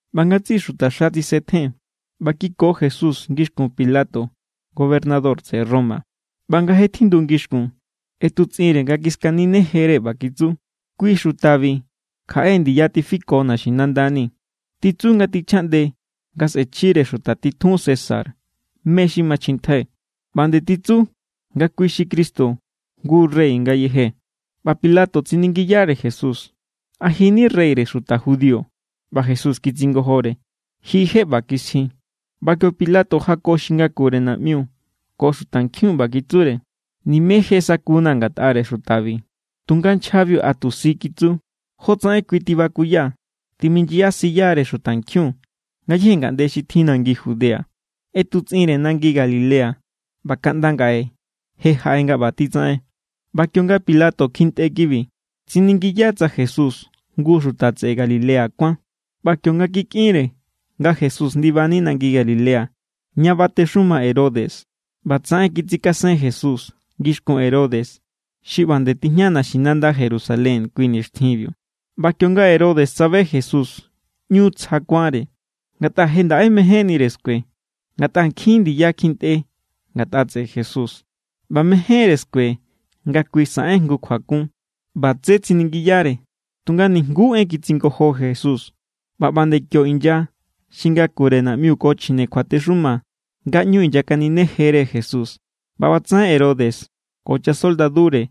ꞌBa ngatsiꞌi xutaxa tsisetjen ꞌba kiko Jesús ngixkun Pilato, gobernador tseꞌe Roma. ꞌBa nga je tjindu ngixkun, ꞌetutsꞌinre nga kiskaninejere, ꞌba kitsu: —Kui xutabi kjaꞌe ndiya tifiko naxinandani̱. Titsu nga tichjaꞌnde nga sꞌe̱chjire xuta titjun César mé= xi machjintjai, ꞌba nde titsu nga kui xi Cristo, jngu rey ngayeje. ꞌBa Pilato tsiningiyare Jesús: —¿A ji= ni reyre xuta judío? ꞌBa Jesús kitsingojore: —Ji je ꞌba kisji. ꞌBa kio Pilato jako xi ngakure naꞌmiu ko xutankjiun, ꞌba kitsure: —Nime je sakuna̱ ngatꞌare xutabi. Tunga nchjabiu a tu si kitsu: —Jotsaꞌen kui tibakuya timinyasiyare xutankjiun ngayéje ngaꞌnde xi tjin nangi Judea. ꞌEtutsꞌinre nangi Galilea ꞌba kaꞌnda ngaꞌe je jaꞌe nga ꞌba titsaꞌen. ꞌBa kionga Pilato kjintꞌe kibi, tsiningiya tsa Jesús jngu xuta tseꞌe Galilea kuán. ꞌBa kionga kikꞌinre nga Jesús ndibani nangi Galilea, ña batexuma Herodes, ꞌbatsaꞌen kitsikasen Jesús ngixkun Herodes, xi ꞌba nde tijña naxinanda Jerusalén kui nixtjinbiu. ꞌBa kionga Herodes tsabe Jesús, ꞌñu tsja kuánre, ngatꞌa je ndaꞌe mejénnire skue. Ngatꞌa nkjin ndiya kjintꞌe ngatꞌa tseꞌe Jesús, ꞌba mejénre skue nga kui saꞌen jngu kjuakun. ꞌBa tsé tsiningiyare, tunga nijnguú en kitsingojo Jesús. ꞌBa ꞌba nde kio inya xi ngakure naꞌmiu ko chjine kjuatexuma nga ꞌñu inyakaninejere Jesús. ꞌBa ꞌbatsaꞌen Herodes ko chasoldadure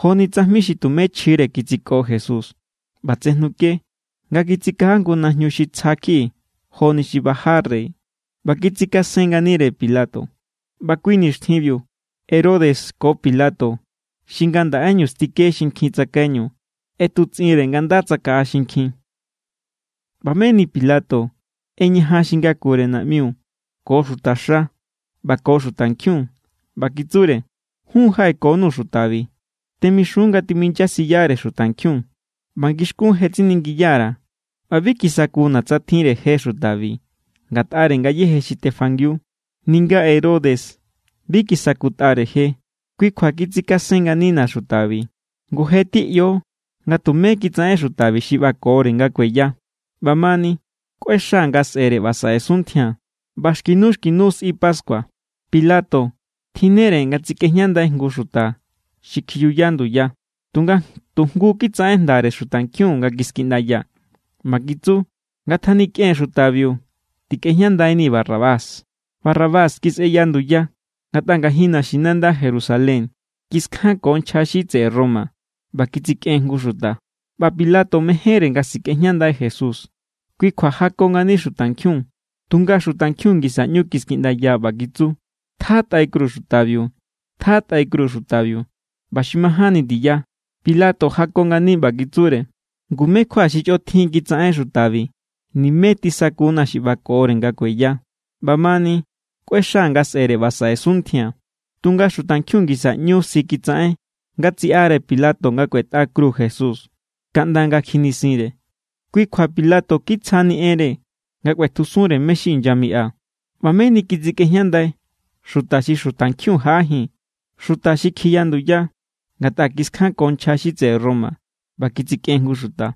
joni tsajmi xi tumé chjire kitsiko Jesús. ꞌBa tsejnuke nga kitsikaja jngu najñu xi tsja kjiꞌi joni xi baja rey, ꞌba kitsikasen nganire Pilato. ꞌBa kui nixtjinbiu Herodes ko Pilato, xi ngandaꞌeñu stike xinkjin tsakaiñu, ꞌetutsꞌinre nga nda tsakaꞌa xinkjin. ꞌBa meni Pilato ꞌeñajan xi ngakure naꞌmiu ko xutaxa ꞌba ko xutankjiun, ꞌba kitsure: —Jun jaꞌekonuu̱ xutabi. Temixun nga timinyasiyare xutankjiun. ꞌBa ngixkún je tsiningiya_ra̱, ꞌba bi kisakuna̱ tsa tjinre je xutabi ngatꞌare ngayéje xi tefangiu. Ninga Herodes bi kisakutꞌare je. Kui kjua kitsikasen nganina xutabi. Ngu, je teꞌyo nga tumé kitsaꞌen xutabi xi ꞌbakore nga kueya. ꞌBamani, kꞌuexaa̱ nga sꞌe̱re ꞌba saꞌe suntjia̱n. ꞌBa xki nu xki nu nga sꞌi pascua, Pilato tjinnere nga tsikꞌejñandai jngu xuta xi kjiyuya nduya. Tunga tu jngu kitsaꞌen jndare xutankjiun nga kiskiꞌndaya, ꞌba kitsu: —¡Ngatjanikꞌen xutabiu! ¡Tikꞌejñandainii̱ Barrabás! Barrabás kisꞌeya nduya, ngatꞌa ngajin naxinanda Jerusalén kiskjanko nchja xi tseꞌe Roma, ꞌba kitsikꞌen jngu xuta. ꞌBa Pilato mejénre nga sikꞌejñandai Jesús, kui kjua jako ngani xutankjiun. Tunga xutankjiun ngisa ꞌñu kiskiꞌndaya, ꞌba kitsu: —¡Tjatꞌai kru xutabiu! ¡Tjatꞌai kru xutabiu! ꞌBa xi majánni ndiya Pilato jako ngani, ꞌba kitsure: —Ngu, ¿mé= kjua xi chꞌotjin kitsaꞌen xutabi? Nimé tisakuna̱ xi ꞌbakore nga kueya. ꞌBamani, kꞌuexaa̱ nga sꞌe̱re ꞌba saꞌe suntjia̱n. Tunga xutankjiun ngisa ꞌñu si kitsaꞌen nga tsiꞌare Pilato nga kꞌuetꞌa kru Jesús, kaꞌnda nga kjinisinre. Kui kjua Pilato kitsjani enre nga kꞌuetjusunre mé= xi inyamiꞌa. ꞌBa meni kitsikꞌejñandai xuta xi xutankjiun jaꞌajin, xuta xi kjiya nduya ngatꞌa kiskjanko nchja xi tseꞌe Roma ꞌba kitsikꞌen jngu xuta.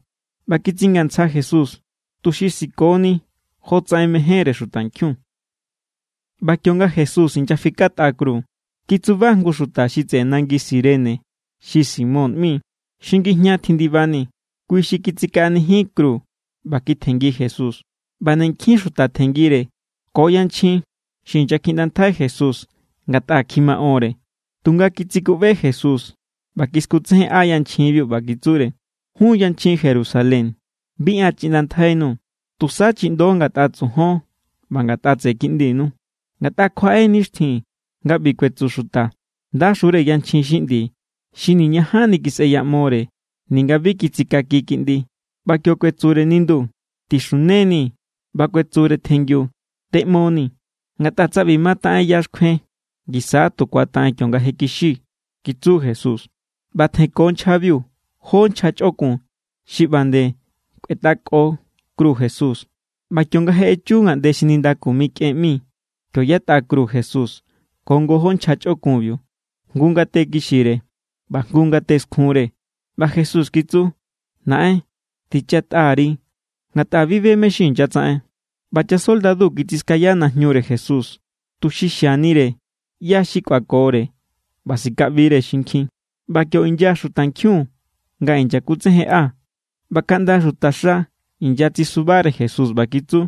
ꞌBa kitsingantsja Jesús, tuxi sikoni jotsaꞌen mejénre xutankjiun. ꞌBa kionga Jesús inyafikatꞌa kru, kitsuba jngu xuta xi tseꞌe nangi Cirene, xi Simón ꞌmi, xi ngijña tjindibani. Kui xi kitsikaꞌanijin kru, ꞌba kitjenngi Jesús. ꞌBa nde nkjin xuta tjenngire ko yanchjin xi inyakjiꞌndantjai Jesús ngatꞌa kjimaꞌonre. Tunga kitsikuꞌbe Jesús ꞌba kiskutsejenꞌa yanchjinbiu, ꞌba kitsure: —Jun yanchjin Jerusalén, bi an chiꞌndantjainuu̱. Tusa chiꞌndo ngatꞌa tsojon ꞌba ngatꞌa tseꞌe kiꞌndinu. Ngatꞌa kjuaꞌe= nixtjin nga ꞌbi kuetsu xuta: “Ndaxure yanchjin xi ꞌndi, xi niñajanni kisꞌeyaꞌmore ninga bi kitsikaki kiꞌndi.” ꞌBa kio kuetsure nindu: “Tixuneni.” ꞌBa kuetsure tjengiu: “Tꞌeꞌmoni.” Ngatꞌa tsa ꞌbi mataꞌen ya xkjuen, ngisa= tu ku̱ataꞌen kionga je kixi —kitsu Jesús. ꞌBa tjenko nchjabiu jó nchja chꞌokun xi ꞌba nde kꞌuetꞌako kru Jesús. ꞌBa kionga je echu ngaꞌnde xi Nindaku Mikꞌen ꞌmi, kio yatꞌa kru Jesús ko ngojó nchja chꞌokunbiu. Jngu ngate kixire ꞌba jngu ngate skjunre. ꞌBa Jesús kitsu: —Naꞌen, tichatꞌa_ri, ngatꞌa bi be mé= xi inyatsaꞌen. ꞌBa chasoldadu kitsiskaya najñure Jesús, tuxi xianire ꞌyá= xi kꞌuakore ꞌba sikaꞌbire xinkjin. ꞌBa kio inya xutankjiun nga inyakutsejenꞌa. ꞌBa kaꞌnda xutaxa inyatsisubare Jesús, ꞌba kitsu: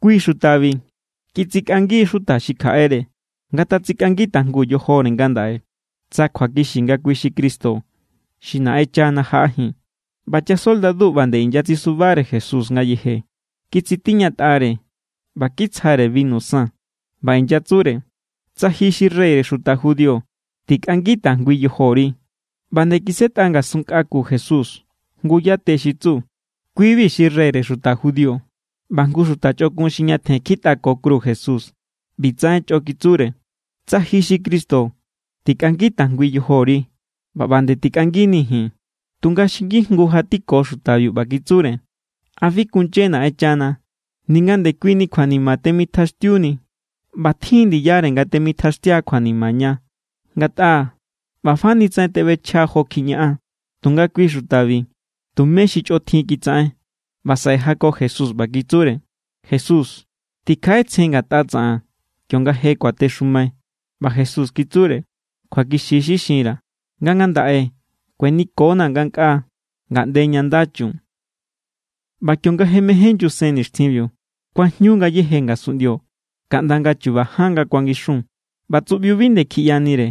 —Kui xutabi kitsikꞌangi xuta xi kjaꞌere. Ngatatsikꞌangi tajngu yojore ngandaꞌe tsa kjuakixi nga kui xi Cristo xi Naꞌenchana jaꞌajin. ꞌBa chasoldadu ꞌba nde inyatsisubare Jesús ngayeje. Kitsitiñatꞌare ꞌba kitsjare binu san. ꞌBa inyatsure: —Tsa ji xi reyre xuta judío, tikꞌangi tajngui yojori. ꞌBa nde kisꞌetꞌa ngasun nkꞌa ku Jesús jngu yate xi tsu: “Kui=bi xi reyre xuta judío.” ꞌBa jngu xuta chꞌokun xi ñatjen kjitꞌako kru Jesús, ꞌbitsaꞌen chꞌo kitsure: —Tsa ji xi Cristo, tikꞌangi tajngui yojori ꞌba ꞌba nde tikꞌanginii̱ ji̱n. Tunga xi ngijngu jatiko xutabiu, ꞌba kitsure: —¿A bi kunye Naꞌenchana, ninga ndekuini kjuanima temitjaꞌaxtiuni? ꞌBa tjin= ndiyare nga temitjaꞌaxtia kjuanima ña, ngatꞌa ꞌba fa ni tsaꞌen teꞌbechja jo kjiñaꞌan. Tunga kui xutabi tumé xi chꞌotjin kitsaꞌen. ꞌBa saꞌe jako Jesús, ꞌba kitsure: —Jesús, tikjaꞌetsjen ngatꞌa tsaꞌan kionga je kuatexumai. ꞌBa Jesús kitsure: —Kjuakixi= xi xinra̱, nga ngandaꞌe kuenikonaa̱ ngankꞌaa, ngaꞌnde ña nda chun. ꞌBa kionga je mején nyusen nixtjinbiu, kuajñu ngayéje ngasunꞌndio kaꞌnda nga̱ chuba ján nga kuangixun. ꞌBa tsuꞌbiu bi nde kjiꞌyanire.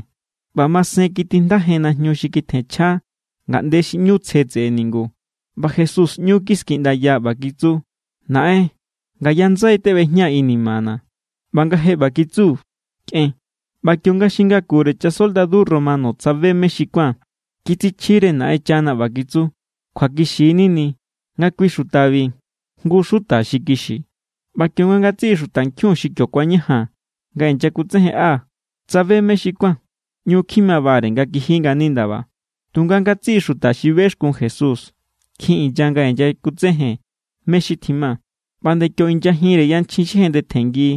ꞌBa masen kitijndajen najñu xi kitjenchja ngaꞌnde xi ꞌñu tsje tseꞌe ningu. ꞌBa Jesús ꞌñu kiskiꞌndaya, ꞌba kitsu: —Naꞌen, ngaya ndsai teꞌbejñaa̱ inimana̱. ꞌBa nga je ꞌba kitsu, kꞌen. ꞌBa kionga xi ngakure chasoldadu Romano tsabe mé= xi kuán, kitsichjire Naꞌenchana, ꞌba kitsu: —Kjuakixi= nini nga kui xutabi jngu xuta xi kixi. ꞌBa kionga ngatsiꞌi xutankjiun xi kio kuañajan nga inyakutsejenꞌa, tsabe mé= xi kuán, ꞌñu kjimabare nga kiji ngani ndaba. Tunga ngatsiꞌi xuta xi bexkun Jesús kjin inya nga inyakutsejen mé= xi tjima. ꞌBa ꞌba nde kio inyajinre yanchjin xi jendetjenngi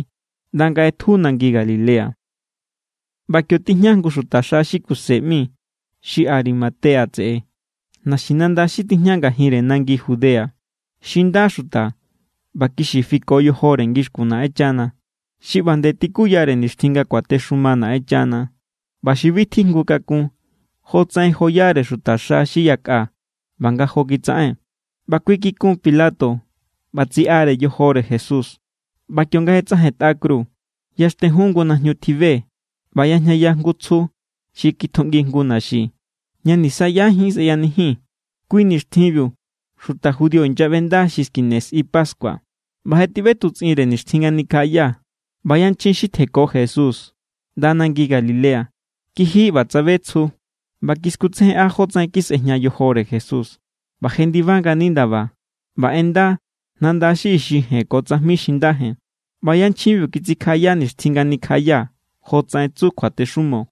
ꞌnda nga ꞌetju nangi Galilea. ꞌBa kio tijña jngu xutaxa xi Kuse ꞌmi xi Arimatea tseꞌe, naxinanda xi tijña ngajinre nangi Judea. Xi nda xuta ꞌba kixi fiko yojore ngixkun Naꞌenchana. Xi ꞌba nde tikuyare nixtjin nga kuatexuma Naꞌenchana ꞌba xi bi tijngu kakun jo tsaꞌen joyare xutaxa xi yakꞌa ꞌba nga jo kitsaꞌen. ꞌBa kui kikun Pilato ꞌba tsiꞌare yojore Jesús. ꞌBa kionga je tsꞌajentꞌa kru, yaxtejun jngu najñu tjibe ꞌba yajñaya jngu tsju xi kitjuꞌngi jngu naxi, ña nisaꞌyajín sꞌeyanijin. Kui nixtjinbiu xuta judío inyaꞌbenda xi skine sꞌi pascua, ꞌba je tiꞌbetutsꞌinre nixtjin nga nikjaꞌaya. ꞌBa yanchjin xi tjenko Jesús ꞌnda nangi Galilea kiji ꞌba tsabe tsju, ꞌba kiskutsejen jótsaꞌen kisꞌejña yojore Jesús. ꞌBa jendiba ngani ndaba ꞌba ꞌenda nanda xi ixi jen ko tsajmi xi nda jen. ꞌBa yanchjinbiu kitsikjaꞌaya nixtjin nga nikjaꞌaya, jotsaꞌen tsu kjuatexumo.